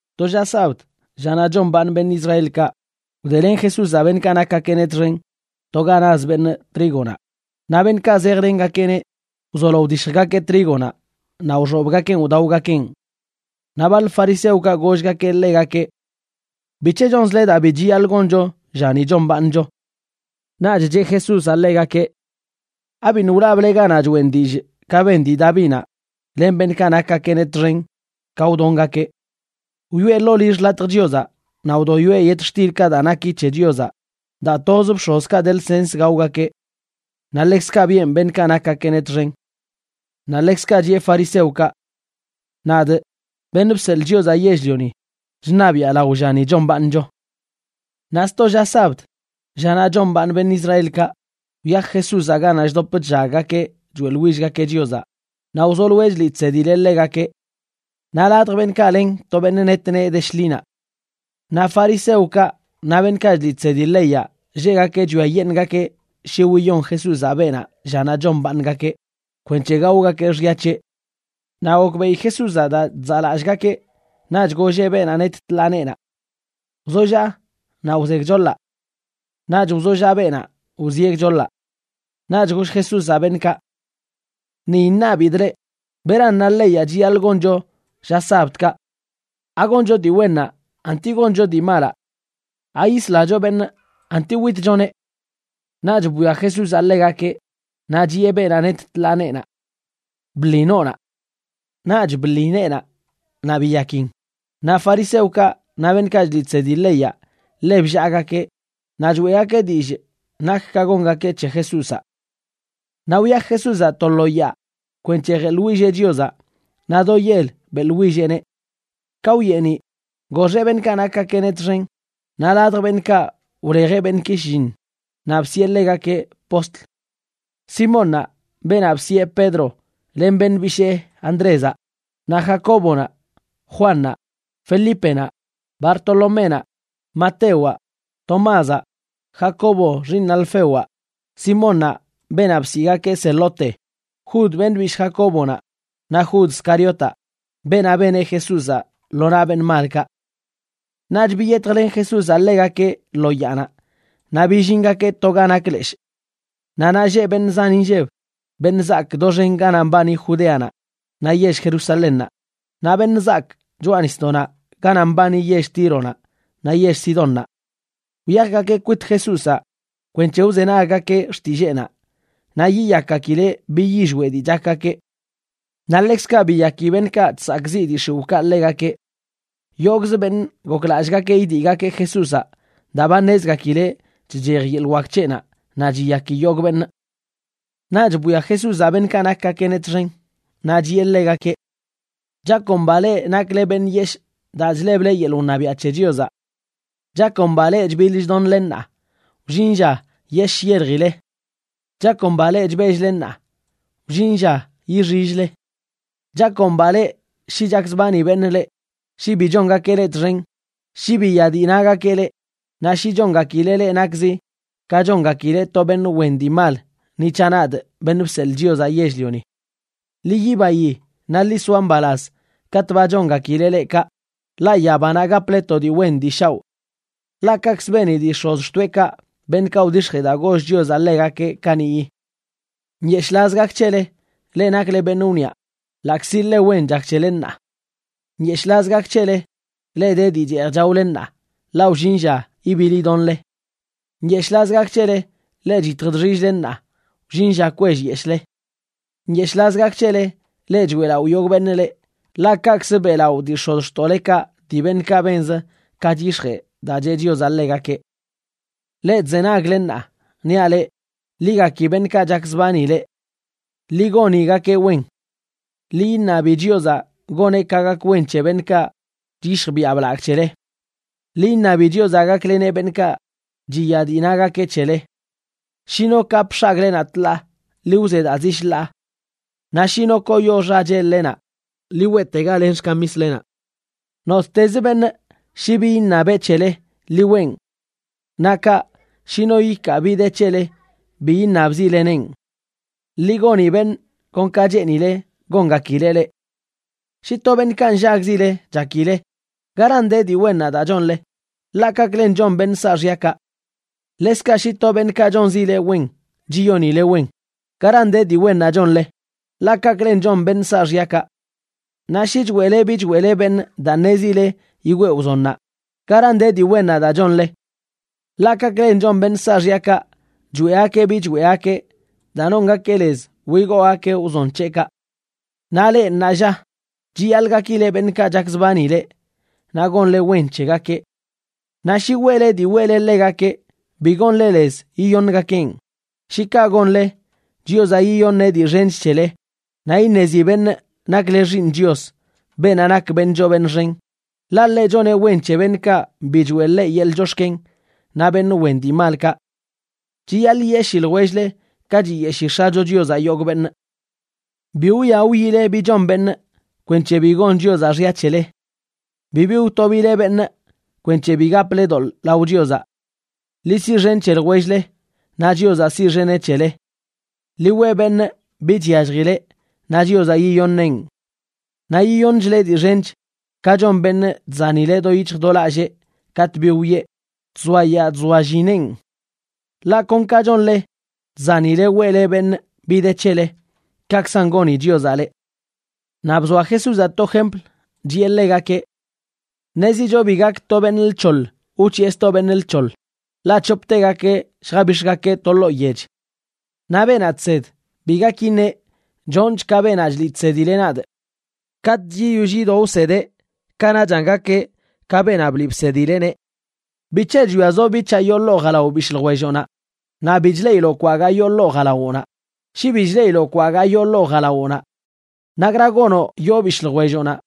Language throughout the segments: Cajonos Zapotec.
To lla sabd, llanaꞌ chombaaṉ beṉꞌ Israelkaꞌ, wdelen Jesúzaꞌ beṉꞌkaꞌ nakgakeꞌneꞌ txen to ga naz beṉꞌ trígonaꞌ, naꞌ beṉꞌkaꞌ zejlengakeꞌneꞌ wzolo wdishjgakeꞌ trígonaꞌ naꞌ wxobgakeꞌn wdaogakeꞌn. Naꞌ baḻ fariseokaꞌ gollgakeꞌ ḻegakeꞌ: ―¿Bic̱he chonzle daa bi chiyaḻꞌ goncho llani chombaaṉcho? Naꞌch cheꞌ Jesúzaꞌ ḻegakeꞌ: ―¿Abiṉꞌ wlable ganaꞌ choꞌen dillꞌ ka ben dii Davinaꞌ len beṉꞌkaꞌ nakgakeꞌneꞌ txen ka wdongakeꞌ? Wyoꞌe ḻoo lill xḻatj Chiozaꞌ naꞌ wdoyoeꞌ yetxtilkaꞌ daa naki c̱he Chiozaꞌ daa toz bx̱ozkaꞌ de lsens gaogakeꞌ. Naꞌ ḻekzkaꞌ biꞌen beṉꞌkaꞌ nakgakeꞌneꞌ txen. Naꞌ ḻekzkaꞌ chiꞌe fariseokaꞌ: ―Nadꞌ, Beṉꞌ Bseḻꞌ Chiozaꞌ Yell-lioni, chṉabiꞌa lao llani chombaaṉcho. Naꞌ sto lla sabd, llanaꞌ chombaaṉ beṉꞌ Israelkaꞌ, wyaj Jesúzaꞌ ganaꞌ chdop chllaggakeꞌ choeꞌḻwillgakeꞌ Chiozaꞌ naꞌ wzoloeꞌ chliꞌ chsedileꞌ ḻegakeꞌ. Naꞌ ladj beṉꞌkaꞌ len to beṉꞌ net nee de shḻinaꞌ. Naꞌ fariseokaꞌ naꞌ beṉꞌkaꞌ chliꞌ chsedi leyaꞌ lleꞌgakeꞌ chwiayeṉꞌgakeꞌ shi wiyon Jesúzaꞌ beenaꞌ llanaꞌ chombaaṉgakeꞌ, kwenc̱he gaogakeꞌ xya c̱heꞌ. Naꞌ gokbeꞌi Jesúzaꞌ daa chzaꞌlallꞌgakeꞌ, naꞌch golleꞌ beenaꞌ net tḻaa neenaꞌ: ―Wzollaꞌ naꞌ wze gchoḻaꞌ. Naꞌch wzollaꞌ beenaꞌ, wzieꞌ gchoḻaꞌ. Naꞌch goll Jesúzaꞌ beṉꞌkaꞌ: ―Ni iṉabidꞌ leꞌ: ¿Beran na leyaꞌ chiyaḻꞌ goncho lla sabdkaꞌ? ¿Agoncho dii wennaꞌ anti goncho dii malaꞌ? ¿Ayislacho beṉꞌ anti witchoneꞌ? Naꞌch bwia Jesúzaꞌ ḻegakeꞌ, naꞌ chiꞌe beenaꞌ net tḻaa neenaꞌ: ―Bḻi noonaꞌ. Naꞌch bḻi neenaꞌ naꞌ biyakin. Naꞌ fariseokaꞌ naꞌ beṉꞌkaꞌ chliꞌ chsedi leyaꞌ ḻe bllaagakeꞌ naꞌ choeꞌgakeꞌ dillꞌ nak ka gongakeꞌ c̱he Jesúzaꞌ. Naꞌ wyaj Jesúzaꞌ to lo yaa kwenc̱he jeḻwilleꞌ Chiozaꞌ, naꞌ do yel beꞌḻwilleꞌneꞌ. Ka wyeeniꞌ, goxeꞌ beṉꞌkaꞌ nakgakeꞌneꞌ txen naꞌ ladj beṉꞌkaꞌ wlejeꞌ beṉꞌki shlliṉ naꞌ bsiꞌe ḻegakeꞌ postl: Simónnaꞌ beenaꞌ bsiꞌe Pedro, len beṉꞌ bishee Andrézaꞌ, naꞌ Jacóbonaꞌ, Juannaꞌ, Felípenaꞌ, Bartoloménaꞌ, Matewaꞌ, Tomázaꞌ, Jacobo xiiṉ Alfewaꞌ, Simónnaꞌ, beenaꞌ bsiꞌgakeꞌ Zelote, Judas, beṉꞌ bishꞌ Jacóbonaꞌa naꞌ Jud Scariotaꞌ, beenaꞌ beneꞌ Jesúzaꞌ lo naꞌ beṉꞌ malkaꞌ. Naꞌch biyetjlen Jesúzaꞌ ḻegakeꞌ lo yaanaꞌ naꞌ billingakeꞌ to ga nak leshꞌ. Naꞌ naꞌ lleꞌ beṉꞌ zan inlleb, beṉꞌ zaak doxen ganaꞌ mbani Judeanaꞌ naꞌ yell Jerusalénnaꞌ, naꞌ beṉꞌ zaak choꞌa nisdoꞌnaꞌ ganaꞌ mbani yell Tíronaꞌ naꞌ yell Sidónnaꞌ. Wyajgakeꞌ kwit Jesúzaꞌ kwenc̱he wzenaggakeꞌ xtilleenaꞌ naꞌ yiyakgakileꞌ bi yillweꞌ dii chakgakeꞌ. Naꞌ ḻekzkaꞌ biyaki beṉꞌkaꞌ chsakꞌziꞌ dii x̱iwꞌkaꞌ ḻegakeꞌ. Yogꞌz beṉꞌ goklallꞌgakeꞌ idiꞌgakeꞌ Jesúzaꞌ daa ba ṉezgakileꞌ chchej yeḻꞌ wak c̱heꞌnaꞌ naꞌ chiyaki yogꞌ beṉꞌ. Naꞌch bwia Jesúzaꞌ beṉꞌkaꞌ nakgakeꞌneꞌ txen, naꞌ chiꞌe ḻegakeꞌ: ―Chakomba leꞌ nakle beṉꞌ yeshꞌ daa chleble yeḻꞌ wṉabiaꞌ c̱he Chiozaꞌ. ’Chakomba leꞌ chbiḻ chdonle ṉaa; wllin lla yesh yeljile. ’Chakomba leꞌ chbell-le ṉaa; wllin lla yixill-le. ’Chakomba leꞌ shi chakzbani beṉꞌ leꞌ, shi bi chongakeꞌ leꞌ txen, shi biya dii nagakeꞌ leꞌ, naꞌ shi chongakileꞌ leꞌ nakzi ka chongakileꞌ to beṉꞌ wen dii mal ni c̱haꞌ, nadꞌ, Beṉꞌ Bseḻꞌ Chiozaꞌ Yell-lioni. Ḻi yibayi, naꞌ ḻi soa mbalaz katꞌ ba chongakileꞌ leꞌ kaꞌ, ḻaꞌ yabanaꞌ gaple to dii wen dii shaoꞌ. Ḻaꞌ kaꞌkzə beni dii x̱ozxtoeꞌkaꞌ beṉꞌkaꞌ wdix̱jee daa goll Chiozaꞌ ḻegakeꞌ kaniꞌyi. ’Nyeshꞌlaz gak c̱hele, leꞌ nakle beṉꞌ wniꞌa, ḻaꞌkzi ḻe wen chak c̱hele ṉaa. ’Nyeshꞌlaz gak c̱hele, leꞌ de dii cheej chaole ṉaa, ḻaꞌ wllin lla ibiḻ idonle. ’Nyeshꞌlaz gak c̱hele, leꞌ chyitj chxill-le ṉaa; wllin lla kwellyeshꞌle. ’Nyeshꞌlaz gak c̱hele, leꞌ choeꞌlaꞌo yogꞌ beṉꞌ leꞌ, ḻaꞌ kaꞌkzə beꞌlaꞌo dii x̱ozxtoꞌlekaꞌ dii beṉꞌkaꞌ benzə ka chyix̱jee daa cheꞌ Chiozaꞌ ḻegakeꞌ. ’Leꞌ chzenagle ṉaa, niaꞌ leꞌ, ḻi gaki beṉꞌkaꞌ chakzbani leꞌ. Ḻi gonigakeꞌ wen. Ḻi iṉabi Chiozaꞌ goneꞌ ka gak wen c̱he beṉꞌkaꞌ chyishj biaꞌ blagꞌ c̱hele. Ḻi iṉabi Chiozaꞌ gakleneꞌ beṉꞌkaꞌ chiya dii nagakeꞌ c̱hele. Shi no kapꞌ x̱agꞌlenaꞌ tḻaa, ḻi wze daa zi shḻaa. Naꞌ shi no koyo xachel-lenaꞌ, ḻi weꞌtega len xkamislenaꞌ. Nottezə beṉꞌ shi bi iṉabeꞌ c̱hele, ḻi weꞌn. Naꞌ kaꞌ, shi no ikaa bi de c̱hele, bi yiṉabzileneꞌn. Ḻi goni beṉꞌ kon ka cheenile gongakileꞌ leꞌ. ’Shi to beṉꞌkaꞌ nllagzile chakile, ¿garan de dii wennaꞌ daa chonle? Ḻaꞌ kaꞌklen chon beṉꞌ saaxyakaꞌ. Ḻekzkaꞌ shi to beṉꞌkaꞌ chonzi leꞌ wen chiyonile wen, ¿garan de dii wennaꞌ chonle? Ḻaꞌ kaꞌklen chon beṉꞌ saaxyakaꞌ. Naꞌ shi choeꞌle bi choeꞌle beṉꞌ daa ṉezile yigwee wzonnaꞌ, ¿garan de dii wennaꞌ daa chonle? Ḻaꞌ kaꞌklen chon beṉꞌ ssaxyakaꞌ, choeꞌgakeꞌ bi choeꞌgakeꞌ daa nongakeꞌ lez wigoogakeꞌ wzon c̱heꞌkaꞌ. Naꞌ leꞌ, ṉaalla, chiyaḻꞌ gakile beṉꞌkaꞌ chakzbani leꞌ, naꞌ gonle wen c̱hegakeꞌ. Naꞌ shi weꞌle dii weꞌle ḻegakeꞌ, bi gonle lez yiyoṉgakeꞌn. Shi kaꞌ gonle, Chiozaꞌ yiyoṉeꞌ dii xench c̱hele, naꞌ iṉezi beṉꞌ nakle xiiṉ Chios, beenaꞌ nak beṉꞌ choo beṉꞌ xen, ḻaꞌ ḻeꞌ choneꞌ wen c̱he beṉꞌkaꞌ bi choeꞌ ḻeꞌ yeḻꞌ chox̱ken naꞌ beṉꞌ wen dii malkaꞌ. Chiyaḻꞌ yiyeshii ljwell-le ka chiyeshii X̱acho Chiozaꞌ yogꞌ beṉꞌ. ’Bi wwia wyile bi chon beṉꞌ, kwenc̱he bi gon Chiozaꞌ xya c̱hele. Bibi wtobileꞌ beṉꞌ, kwenc̱he bi gaple doḻꞌ lao Chiozaꞌ. Ḻi siꞌxen c̱he ljwell-le, naꞌ Chiozaꞌ siꞌxeneꞌ c̱hele. Ḻi weꞌ beṉꞌ bi chyalljileꞌ naꞌ Chiozaꞌ yiyoṉeꞌn. Naꞌ yiyoṉchleꞌ dii xench, ka chon beṉꞌ chzanileꞌ do yic̱hj do lallee katꞌ bi wiꞌe, chzoayaa chzoallineꞌn. Ḻaꞌ kon ka chonle chzanileꞌ weꞌle beṉꞌ bi de c̱hele, kaꞌkzan goni Chiozaꞌ leꞌ. Naꞌ bzoa Jesúzaꞌ to jempl, chiꞌe ḻegakeꞌ: ―Ṉezicho bi gak to beṉꞌ lc̱hoḻ wc̱hiꞌe sto beṉꞌ lc̱hoḻ, ḻaꞌ c̱hoptegakeꞌ lljabix̱gakeꞌ to ḻoo yech. Naꞌ beenaꞌ chsed bi gak iṉeꞌ: “Chonchꞌ ka beenaꞌ chliꞌ chsedileꞌ nadꞌ.” Katꞌch yiyoll yido wsedeꞌ, kanaꞌchan gakeꞌ ka beenaꞌ bliꞌ bsedileꞌneꞌ. ’¿Bic̱he chwiazoꞌ bic̱haꞌ yoo ḻoo jalao bishꞌ ljwelloꞌnaꞌ naꞌ bi chileꞌiloꞌ kwagaa yoo ḻoo jalawoꞌnaꞌ? Shi bi chleꞌiloꞌ kwagaa yoo ḻoo jalawoꞌnaꞌ, ¿nakra gonoꞌ yoo bishꞌ ljwelloꞌnaꞌ: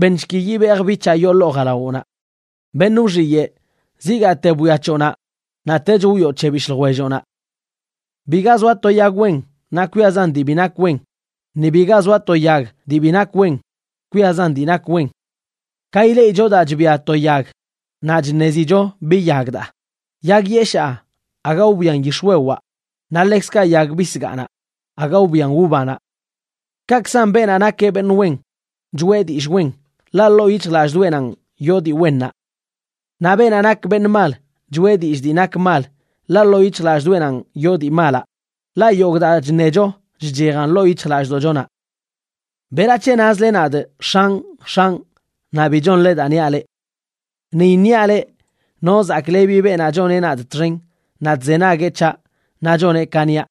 “Beṉshki yibejꞌ bic̱haꞌ yoo ḻoo jalawoꞌnaꞌ”? ¡Beṉꞌ wxiyeꞌ! Zigaate bwia c̱hoꞌnaꞌ naꞌ tech wwioꞌ c̱heꞌ bishꞌ ljwelloꞌnaꞌ. ’Biga zoa to yag wen naꞌ kwiazan dii bi nak wen, ni biga zoa to yag dii bi nak wen kwiazan dii nak wen. Ka ileꞌicho daa chbia to yag, naꞌ chṉezicho bi yag daa. Yag yeshaa aga wbian yix̱wewaꞌ, naꞌ ḻekzkaꞌ yag bisgaanaꞌ aga wbian uvanaꞌ. Kaꞌkzan beenaꞌ nak beṉꞌ wen, choeꞌ dillꞌ wen, ḻaꞌ ḻoo yic̱hjlallꞌdoꞌenanꞌ yoo dii wennaꞌ. Naꞌ beenaꞌ nak beṉꞌ mal, choꞌe dillꞌ dii nak mal, ḻaꞌ ḻoo yic̱hjlallꞌdoꞌenanꞌ yoo dii malaꞌ, ḻaꞌ yogꞌ daa chṉecho chchejan ḻoo yic̱hjlallꞌdoꞌchonaꞌ. ’¿Berac̱he nazle nadꞌ “X̱anꞌ, X̱anꞌ”, naꞌ bi chonle daa niaꞌ leꞌ? Ni iṉiaꞌ leꞌ no zaklebi beenaꞌ choneꞌ nadꞌ txen naꞌ chzenagueꞌ c̱haꞌ naꞌ choneꞌ ka niaꞌ.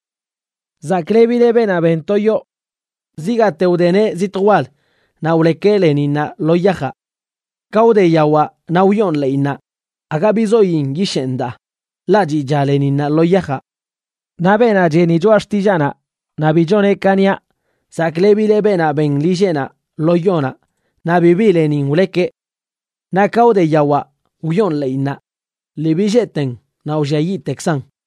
Zaklebileꞌ beenaꞌ ben to yoo. Zigaate wdeneꞌ zitj wal naꞌ wlekeꞌ leninnaꞌ lo yajaꞌ. Ka wde yawaꞌ naꞌ wyoon ḻeꞌinnaꞌ, aga bizoyin yisheen daa, ḻaꞌ chiꞌcha leninnaꞌ lo yajaꞌ. Naꞌ beenaꞌ cheni choꞌa xtillaanaꞌ naꞌ bi choneꞌ ka niaꞌ, zaklebileꞌ beenaꞌ ben lilleꞌnaꞌ lo yonaꞌ naꞌ bibi lenin wlekeꞌ. Naꞌ ka wde yawaꞌ wyoon ḻeꞌinnaꞌ, lii billeeten naꞌ wlliayiꞌtekkzan.